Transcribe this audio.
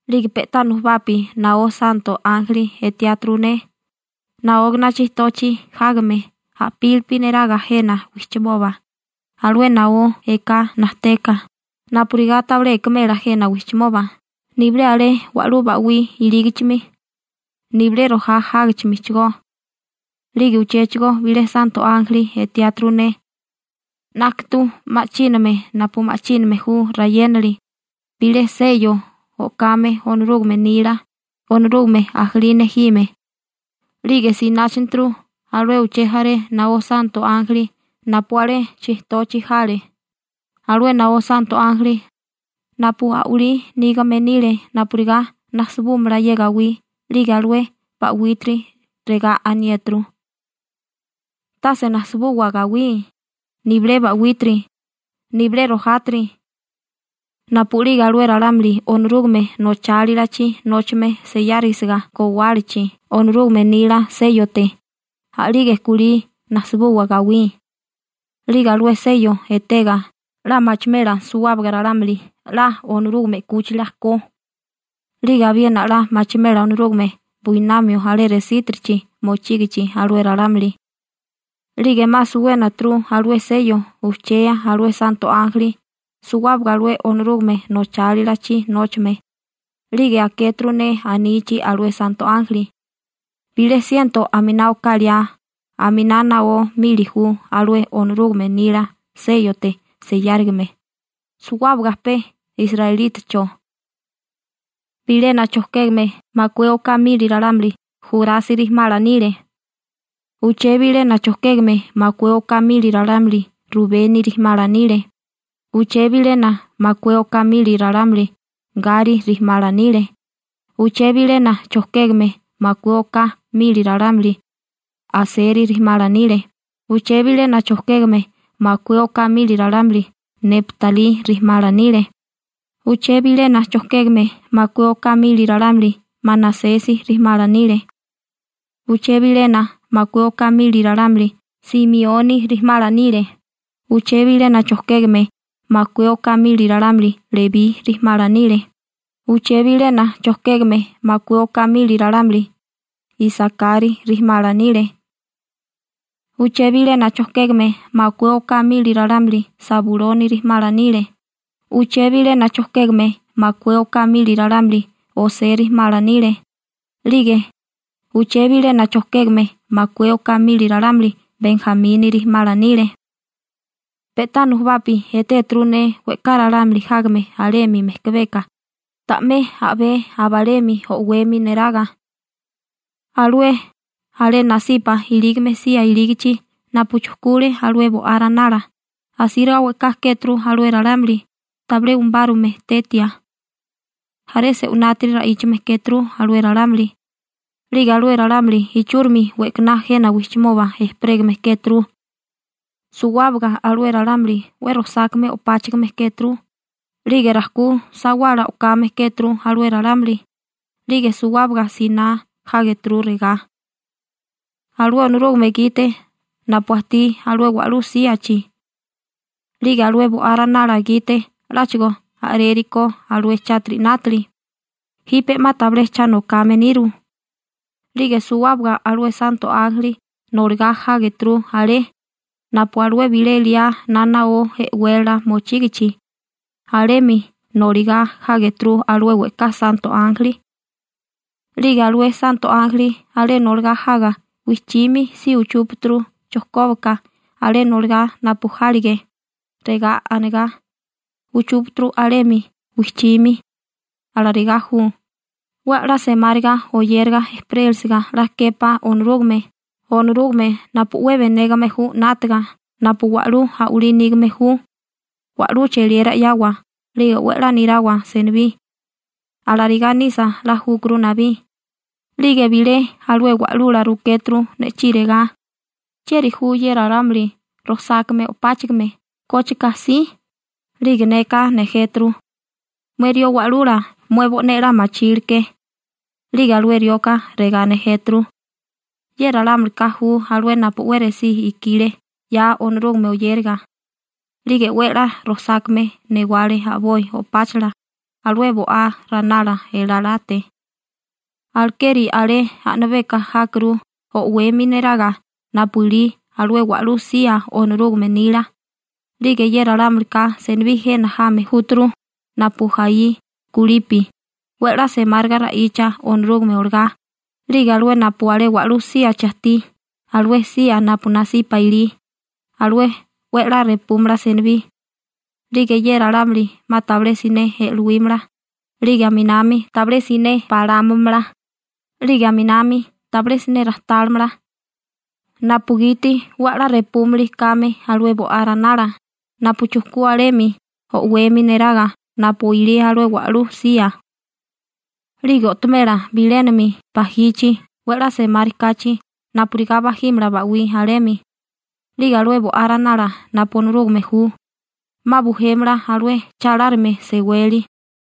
'Lige pe'tá nujubapi naó santo ánjeli etiáturu ne naógana chijtochi jágame a'pílipi neraga jena wijchimoba alué naó eká najteka napurigá tabilé ekemela jena wijchimoba, nibilé alé wa'lú ba'wí ilígichimi, nibilé rojá jágichimichigó. 'Lige uchéchigo bilé santo ánjeli etiáturu ne 'nákatu ma'chíname napu ma'chíname ju rayénali, bilé seyo o'kame Onorúgame nila, Onorúgame ajalí nejime, 'lige sináchaturu alué uché jaré naó santo ánjeli napu alé chijtochi jale, alué naó santo ánjeli napu a'walí nígame nile napurigá najsibúmala ye gawí 'lige alué ba'wítiri. Regá aniéturu: ―Tase najsibuwa gawí, nibilé ba'wítiri, nibilé rojátiri. Napu'lige alué ralámuli Onorúgame nochálilachi nóchame seyárisiga gowálachi Onorúgame nila séyote, a'lige kulí najsibuwa gawí. 'Lige alué seyo etega 'la machimela suwábaga ralámuli 'la Onorúgame 'kúchila ko, 'lige abiena 'la machimela Onorúgame buinamio alé resítirichi mochígichi alué ralámuli. 'Lige 'ma suwénaturu alué seyo ujchea alué santo ánjeli suwábaga alué Onorúgame nochálilachi nóchame, 'lige akéturu ne anichi alué santo ánjeli: ―Bilé siento aminá oká liá aminá naó mili ju alué Onorúgame nila séyote seyáririgame. Suwábaga pe israelítacho. Bilena chojkégame makué oká mili ralámuli Jurasi rijimala nile. Uché bilena chojkégame makué oká mili ralámuli Rubeni rijimala nile. Uché bilena makué oká mili ralámuli Gari rijimala nile. Uché bilena chojkégame makué oká mili ralámuli Aseri rijimala nile. Uché bilena chojkégame makué oká mili ralámuli Neptalí rijimala nile. Uché bilena chojkégame makué oká mili ralámuli Manasesi rijimala nile. Uché bilena makué oká mili ralámuli Simioni rijimala nile. Uché bilena chojkégame makué oká mili ralámuli Lebí rijimala nile. Uché bilena chojkégame makué oká mili ralámuli Isakari rijimala nile. Uché bilena chojkégame makué oká mili ralámuli Sabuloni rijimala nile. Uché bilena chojkégame makué oká mili ralámuli José rijimala nile. 'Lige uché bilena chojkégame makué oká mili ralámuli Benjamini rijimala nile. Pe'tá nujubapi etéturu ne we'ká ralámuli jágame alemi mejkabeka ta'mé a'bé abalemi o'wemi neraga alué alé nasipa ilígame sía ilígichi napu chujkule alué Bo'á Ranala. Asíriga we'ká kéturu alué ralámuli tabilé umubárume tetia. Jaré se'winátiri ra'íchame kéturu alué ralámuli, 'lige alué ralámuli ichúrimi we'kaná jena wijchimoba ejperégame kéturu. Suwábaga alué ralámuli 'we rojsákame o'páchagame kéturu, 'lige rajkú sawala o'kame kéturu alué ralámuli. 'Lige suwábaga siná jágeturu regá: Alué Onorúgame gite napu ajtí alué wa'lú síachi 'lige alué Bo'á Ranala gite 'láchigo a'rérikó alué chátiri 'nátali, jipe 'ma tabilé cha nokame niru. 'Lige suwábaga alué santo ánjeli noligá jágeturu, alé napu alué bilé liá na naó e'wélala mochígichi, alemi noligá jágeturu alué we'ká santo ánjeli. 'Lige alué santo ánjeli alé noligá jaga wijchimi si uchúpaturu chojkóbaka alé noligá napu jálige, regá anigá uchúpaturu alemi wijchimi: Alarigá ju. 'We 'la semáriga oyéraga ejperélisiga 'la képá Onorúgame, Onorúgame napu 'we benégame ju 'nátaga, napu wa'lú a'walí nígame ju, wa'lú cheliera 'yawa 'lige 'we 'la nirawa senibí. Alarigá nisa 'la júkuru nabí. 'Lige bilé alué wa'lula rukéturu ne'chí regá: ―¿Chieri ju ye ralámuli rojsákame o'páchigime? ¿Kócheka si? 'Lige neka nejéturu: ―Mué rió wa'lula, mué bo'né 'la machilke. 'Lige alué rioka regá nejéturu: ―Ye ralámulika ju alué napu 'we resí ikile 'ya Onorúgame oyériga. 'Lige 'we 'la rojsákame newale a'boi o'páchala alué Bo'á Ranala elalate. Alekeri alé a'nabeka jákuru o'wemi neraga napu ilí alué wa'lú sía Onorúgame nila. 'Lige ye ralámulika, senibí jena jame júturu napu jaí kulipi 'we 'la semáriga ra'icha Onorúgame olagá 'lige alué napu alé wa'lú síachi ajtí, alué sía napu nasipa ilí, alué 'we 'la repúmala senibí. 'Lige ye ralámuli 'ma tabilé siné e'lowímala, 'lige aminami tabilé siné balámamala, 'lige aminami tabilé siné rajtálimala napugiti 'we 'la repúmili kame alué Bo'á Ranala napu chujkú alemi o'wemi neraga napu ilí alué wa'lú sía, 'lige o'tomela bilénami bajichi 'we 'la semárikáchi napurigá bajímala ba'wí alemi. 'Lige alué Bo'á Ranala napu Onorúgame ju, 'ma bujémala alué cha lárime seweli.